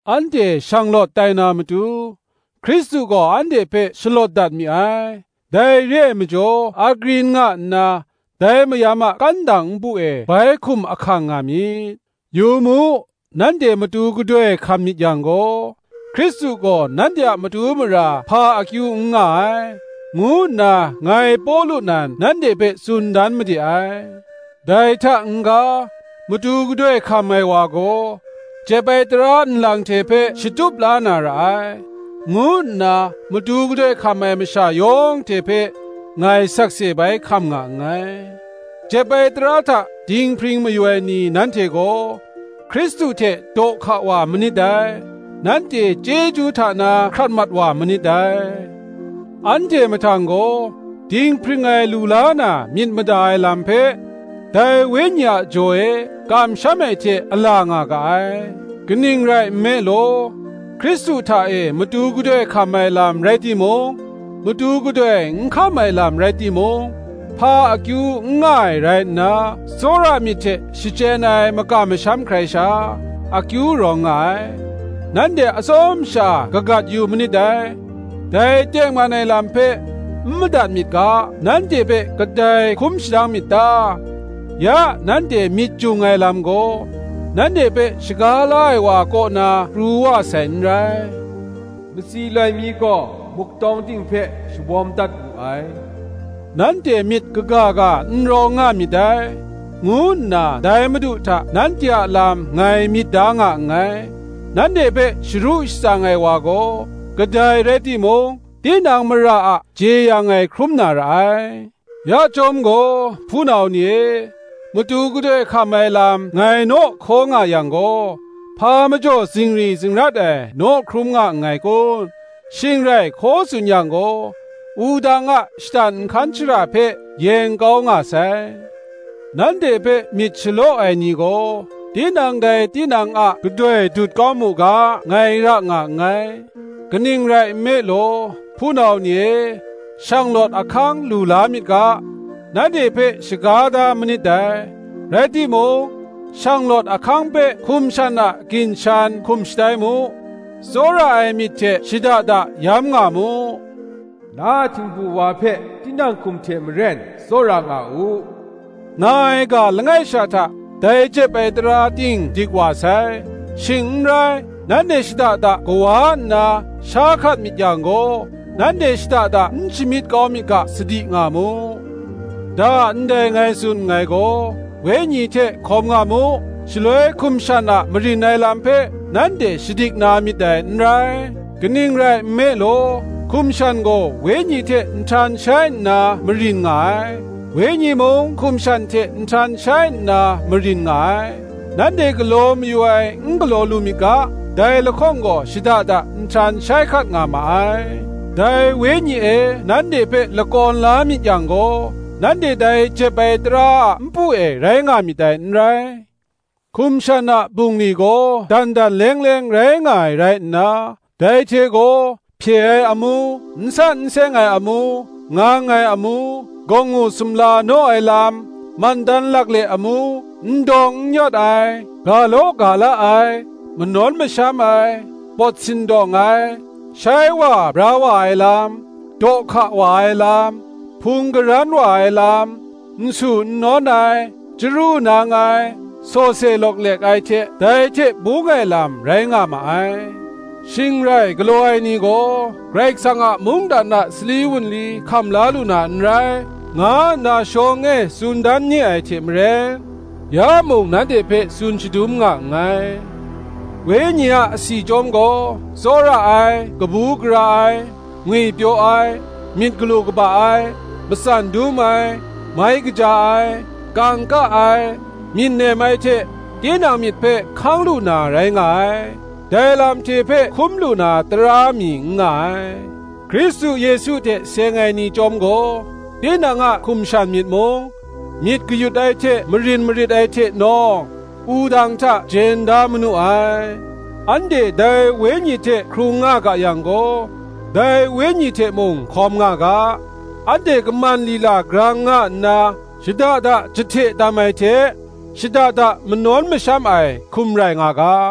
Anhte shanglawt tai na matu, Hkristu gaw anhte hpe shalawt dat mi ai: dai re ai majaw agrin nga nna, dai mayam a kandang npu e bai hkum ahkang nga myit. Yu mu, nanhte matu gadoi hkam myit yang gaw, Hkristu gaw nanhte a matu mara hpa akyu n nga ai, ngu nna ngai Pawlu nan nanhte hpe tsun dan made ai. Dai hta n-ga, matu gadoi hkam ai wa gaw, jep ai tara nlang hte hpe shatup la na ra ai, ngu nna matu gadoi hkam ai masha yawng hte hpe, ngai sakse bai hkam nga nngai. Jep ai tara hta dinghpring mayu ai ni, nanhte gaw Hkristu hte daw hka wa manit dai; nanhte chyeju hta na hkrat mat wa manit dai. Anhte mahtang gaw, dinghpring ai lu la na myit mada ai lam hpe, dai Wenyi a jaw e kamsham ai hte a la nga ga ai. Kaning rai nme law, Hkristu hta e matu gadoi hkam ai lam rai timung, matu gadoi n hkam ai lam rai timung, hpa akyu n nga ai rai nna, tsawra myit hte shachyen ai makam masham hkrai sha, akyu rawng nga ai. Nanhte atsawm sha kagat yu manit dai: dai tengman ai lam hpe n madat myit ga, nanhte hpe kadai hkum shadang myit ta? Ya nanhte myit jung ai lam gaw, nanhte hpe shaga la ai wa kaw na pru wa sai n rai. Matsi loi mi gaw muk tawng ting hpe shawawm dat wu ai. Nanhte myit kaga ga n rawng nga myit dai, ngu nna dai Madu hta nanhte a lam ngai myit da nga nngai: nanhte hpe sharu shatsang ai wa gaw, kadai rai timung, tinang mara a jeyang ai hkrum na ra ai. Ya chyawm gaw, hpunau ni e, matu gadoi hkam ai lam ngai naw hkaw nga yang gaw, hpa majaw zingri zingrat ai naw hkrum nga nngai kun? shing rai hkaw tsun yang gaw, wudang a shatan nhkan shara hpe yeng kau nga sai. Nanhte hpe myit shalaw ai ni gaw, tinang dai tinang a gadoi dut kau mu ga, ngai ra nga nngai. Kaning rai nme law, hpunau ni e, shanglawt ahkang lu la myit ga, nanhte hpe shaga da manit dai: rai timung, shanglawt ahkang hpe hkum shan a ginshan hkum shatai mu; tsawra ai myit hte shada da yamnga mu. Na a htingbu wa hpe tinang hkum hte maren tsawra nga u, nga ai ga langai sha hta, dai jep ai tara ting dik wa sai. Shing n rai, nanhte shada da kawa nna sha hkat myit yang gaw, nanhte shada da n shamyit kau myit ga, sadi nga mu. Da ndai ngai tsun nngai gaw, Wenyi hte hkawm nga mu; shaloi hkum shan a marin ai lam hpe nanhte shadik na myit dai n rai. Kaning rai nme law, hkum shan gaw Wenyi hte nhtan shai nna marin nga ai; Wenyi mung hkum shan hte nhtan shai nna marin nga ai: nanhte galaw mayu ai n galaw lu myit ga, dai lahkawng gaw shada da nhtan shai hkat nga ma ai. Dai Wenyi e nanhte hpe lakawn la myit yang gaw, nanhte dai jep ai tara a npu e rai nga myit dai n rai. Hkum shan a bungli gaw dan dan leng leng rai nga ai rai nna, dai hte gaw: hpye ai amu, n san n seng ai amu, ngang ai amu, gawngngu sumla naw ai lam, Mandan lakle amu, n dawng n yawt ai, ga law ga la ai, manawn masham ai, pawt sindawng ai, shai wa bra wa ai lam, daw hka wa ai lam, hpung karan wa ai lam, nsu nnawn ai, chyaru nang ai, sawse lawklek ai hte bung ai lam rai nga ma ai; shing rai galaw ai ni gaw, Karai Kasang a mungdan a sali wunli hkam la lu na n rai, nga nna shawng e tsun dan ni ai hte maren, ya mung nanhte hpe tsun shadum nga nngai. Wenyi a asi chyawm gaw tsawra ai, kabu gara ai, ngwipyaw ai, myit galu kaba ai, matsan dum ai, mai kaja ai, kangka ai, myit nem ai hte tinang myit hpe hkang lu na rai nga ai: dai lam hte hpe hkum lu na tara mi n nga ai. Hkristu Yesu hte seng ai ni chyawm gaw, tinang a hkum shan myit mung, myit kayut ai hte marin marit ai hte nawng, wudang hta jen da manu ai. Anhte dai Wenyi hte hkrung nga ga yang gaw, dai Wenyi hte mung hkawm nga ga. Anhte kaman lila grang nga nna, shada da jahte tam ai hte, shada da manawn masham ai, hkum rai nga ga.